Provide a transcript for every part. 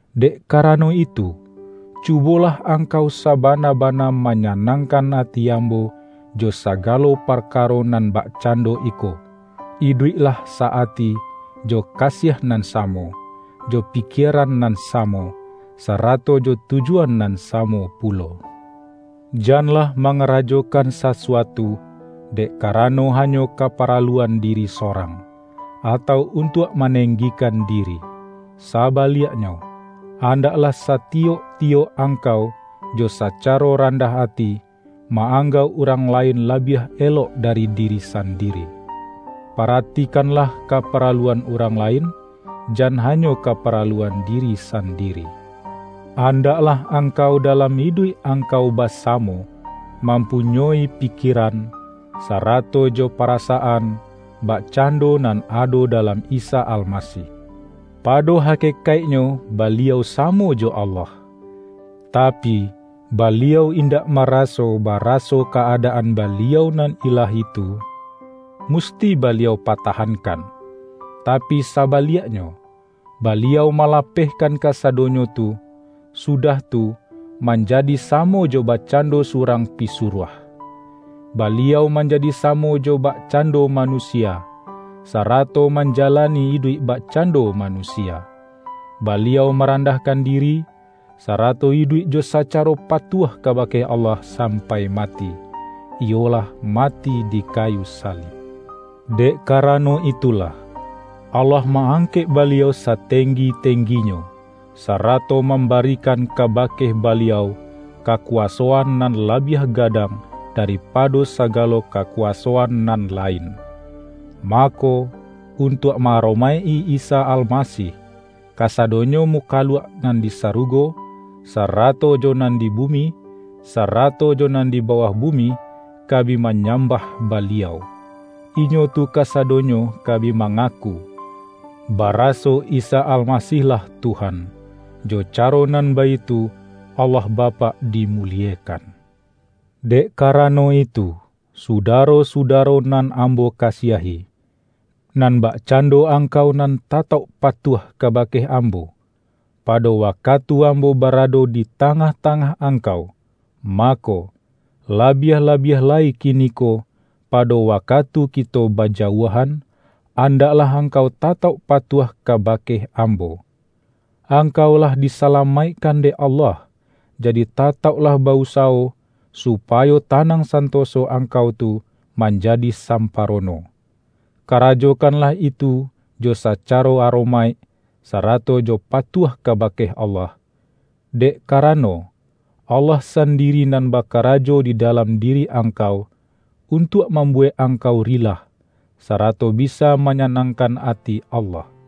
Dek karano itu, cubolah angkau sa-bana-bana manyanangkan ati ambo jo sagalo parkaro nan bakcando iko: Iduiklah sa-ati jo kasiah nan samo, jo pikieran nan samo, sarato jo tujuan nan samo pulo. Janlah mangarajokan sasuatu, dek karano hanyo kaparalu-an diri sorang, atau untuak maneng-gikan diri. Sabaliaknyo, andaklah sati-yok-tiyok angkau jo sacaro randah ati, ma-anggauk urang lain labiah elok da-ri diri sandiri. Paratikanlah kapara-luan urang lain; jan hanyo kaparaluan diri sandiri. Andaklah angkau dalam iduik angkau basamo, mampunyoi pi-kieran, sarato jo parasaan, bakcando nan ado dalam Isa Almasih: Pado hakekaiknyo Baliau samo jo Allah, tapi, Baliau indak maraso baraso ka-adaan Baliau nan Ilahi tu, musti Baliau patahankan. Tapi sabaliaknyo, Baliau malapehkan kasadonyo tu, sudah tu, manjadi samo jo bakcando surang pisuruah. Baliau manjadi samo jo bakcando manusia, sarato manjalani iduik bakcando manusia. Baliau marandahkan diri, sarato iduik jo sacaro patuah kabake Allah sampai mati — iyolah mati di kayu salib. Dek karano itulah, Allah ma-angkek Baliau satenggi-tengginyo, sarato mambarikan kabake Baliau, kakuwasoan nan labiah gadang daripado sagalo kakuwasoan nan lain. Mako, untuak ma-aromaik-i Isa Almasih, kasadonyo mukaluak nan di sarugo, sarato jo nan di bumi, sarato jo nan di bawah bumi, ka bi manyambah Baliau. Inyo tu kasadonyo ka bi mangaku, baraso Isa Almasih-lah Tuhan; jo caro nan baitu Allah Bapak dimuliekan. Dek karano itu, sudaro-suda-ro nan ambo kasiahi, nan bakcan-do angkau nan tatauk patuah kabake ambo, pado wakatu ambo barado di tangah-tangah angkau, mako, labiah-labiah lai kiniko pado wakatu kito bajauahan, andaklah angkau tatauk patuah kabake ambo. Angkau lah di-salamaikkan dek Allah, jadi tatauk-lah ba-usawo, supayo tanang santoso angkau tu manjadi samparono. Kara-jokanlah itu jo sacaro aromaik, sara-to jo patuah kabake Allah, dek ka-rano, Allah sandiri nan bakarajo di dalam diri angkau, untuak mambu-wek angkau rilah, sarato bisa manya-nangkan ati Allah.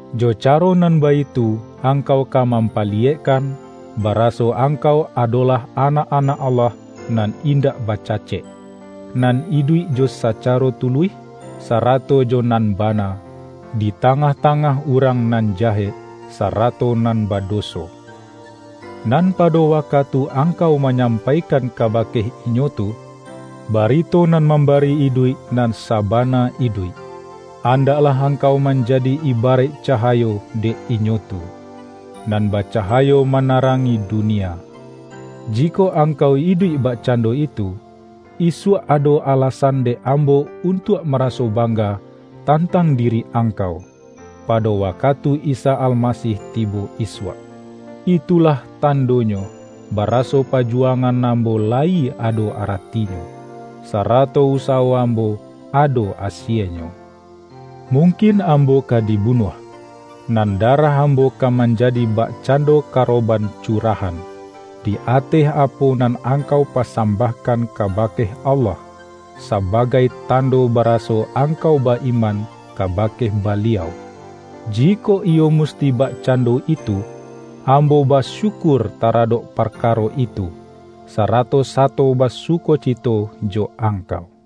Jo caro nan baitu angkau ka mampaliyekkan, ba-raso angkau adolah anak-anak Allah nan indak bacacek, nan iduik jo saca-ro tuluih, sarato jo nan bana, di ta-ngah-tangah urang nan jahek, sarato nan badoso. Nan pado wakatu ang-kau manyampaikan kabake inyo tu, barito nan mambari iduik nan saba-na iduik, andaklah angkau manjadi ibaraik cahayo dek inyo tu, nan baca-hayo manarangi dunia. Jikok angkau iduik bakcando itu, isuak ado ala-san dek ambo untuak maraso bang-ga tantang diri angkau, pado wakatu Isa Almasih tibo isuak. Itulah tan-donyo baraso pajuwangan ambo layi ado aratinyo, sarato usawo ambo ado asienyo. Mungkin ambo ka dibunuah, nan darah ambo ka manjadi bakcando ka-roban curahan, di ateh apo nan ang-kau pasambahkan kabake Allah, sa-bagai tando baraso angkau ba-iman kabake Baliau. Jikok iyo musti bak-cando itu, ambo basyukur taradok parkaro itu, sarato sato basukocito jo angkau.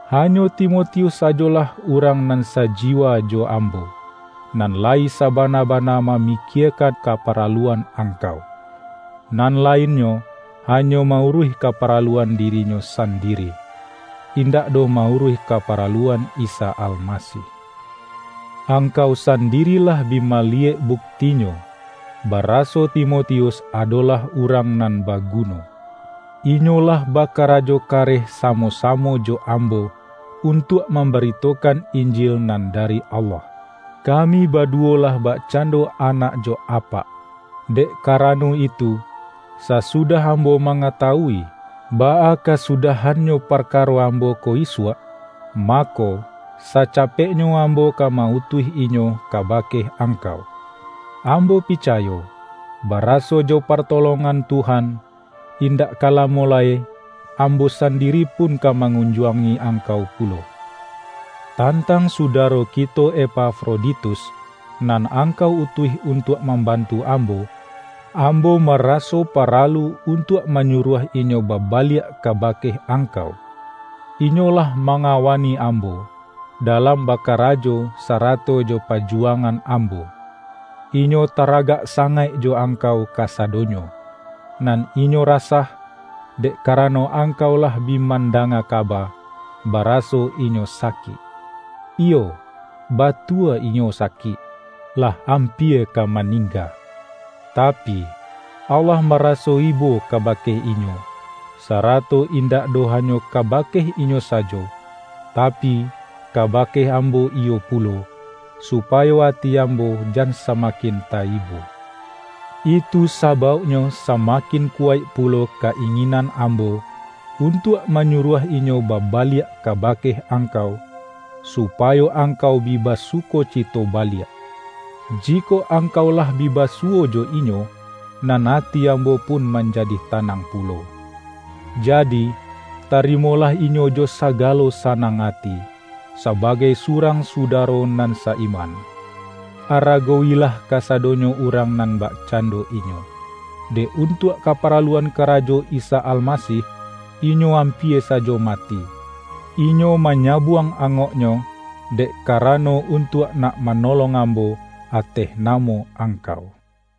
Ha-nyo Timotius sajolah urang nan saji-wa jo ambo, nan layi sabana-bana ma-mikiekan kaparaluan angkau. Nan lainnyo hanyo ma-uruih kaparaluan dirinyo sandiri, indak doh ma-uruih kaparaluan Isa Almasih. Angkau sandiri lah bi maliyek buktinyo, bara-so Timotius adolah urang nan baguno. Inyo lah bakarajo kareh samo-samo jo ambo, untuak mambaritokan Injil nan dari Allah. Kami baduwo lah bakcan-do anak jo apak. Dek karano itu, sasudah ambo mangatawui, baa ka-sudahannyo parkaro ambo ko isuak, mako, sacapeknyo ambo ka ma-utuih inyo kabake angkau. Ambo picayo, baraso jo partolongan Tuhan, indak ka lamo lai ambo sandiri pun ka ma-ngunjuangi angkau pulo. Tantang sudaro kito Epafroditus, nan angkau utuih untuak mamban-tu ambo, ambo maraso paralu untuak manyuruah inyo babaliak kabake ang-kau. Inyo lah mangawani ambo, dalam bakarajo sarato jo pajuwangan ambo. Inyo taragak sangaik jo angkau ka-sadonyo, nan inyo rasah, dek karano angkau lah bi mandanga kaba, baraso inyo sakik. Iyo, batua inyo sakik, lah ampia ka maningga. Tapi, Allah maraso ibo kabake inyo; sarato indak doh hanyo kabake inyo sajo, tapi, ka-bake ambo iyo pulo, supayo ati am-bo jan samakin ta-ibo. Itu sabauk-nyo samakin kuwaik pulo ka-inginan ambo, untuak manyuruah inyo baba-liak kabake angkau, supayo angkau bi basukocito baliak, jikok angkau lah bi basuwo jo inyo, nan ati ambo pun manjadi tanang pulo. Jadi, tarimo-lah inyo jo sagalo sanang ati, sabagai surang sudaro nan sa-iman. Aragowi-lah kasadonyo urang nan bakcando inyo. Dek untuak kaparaluan kara-jo Isa Almasih, inyo ampia sajo mati; inyo manyabuang angoknyo, dek ka-rano untuak nak manolong ambo ateh namo angkau.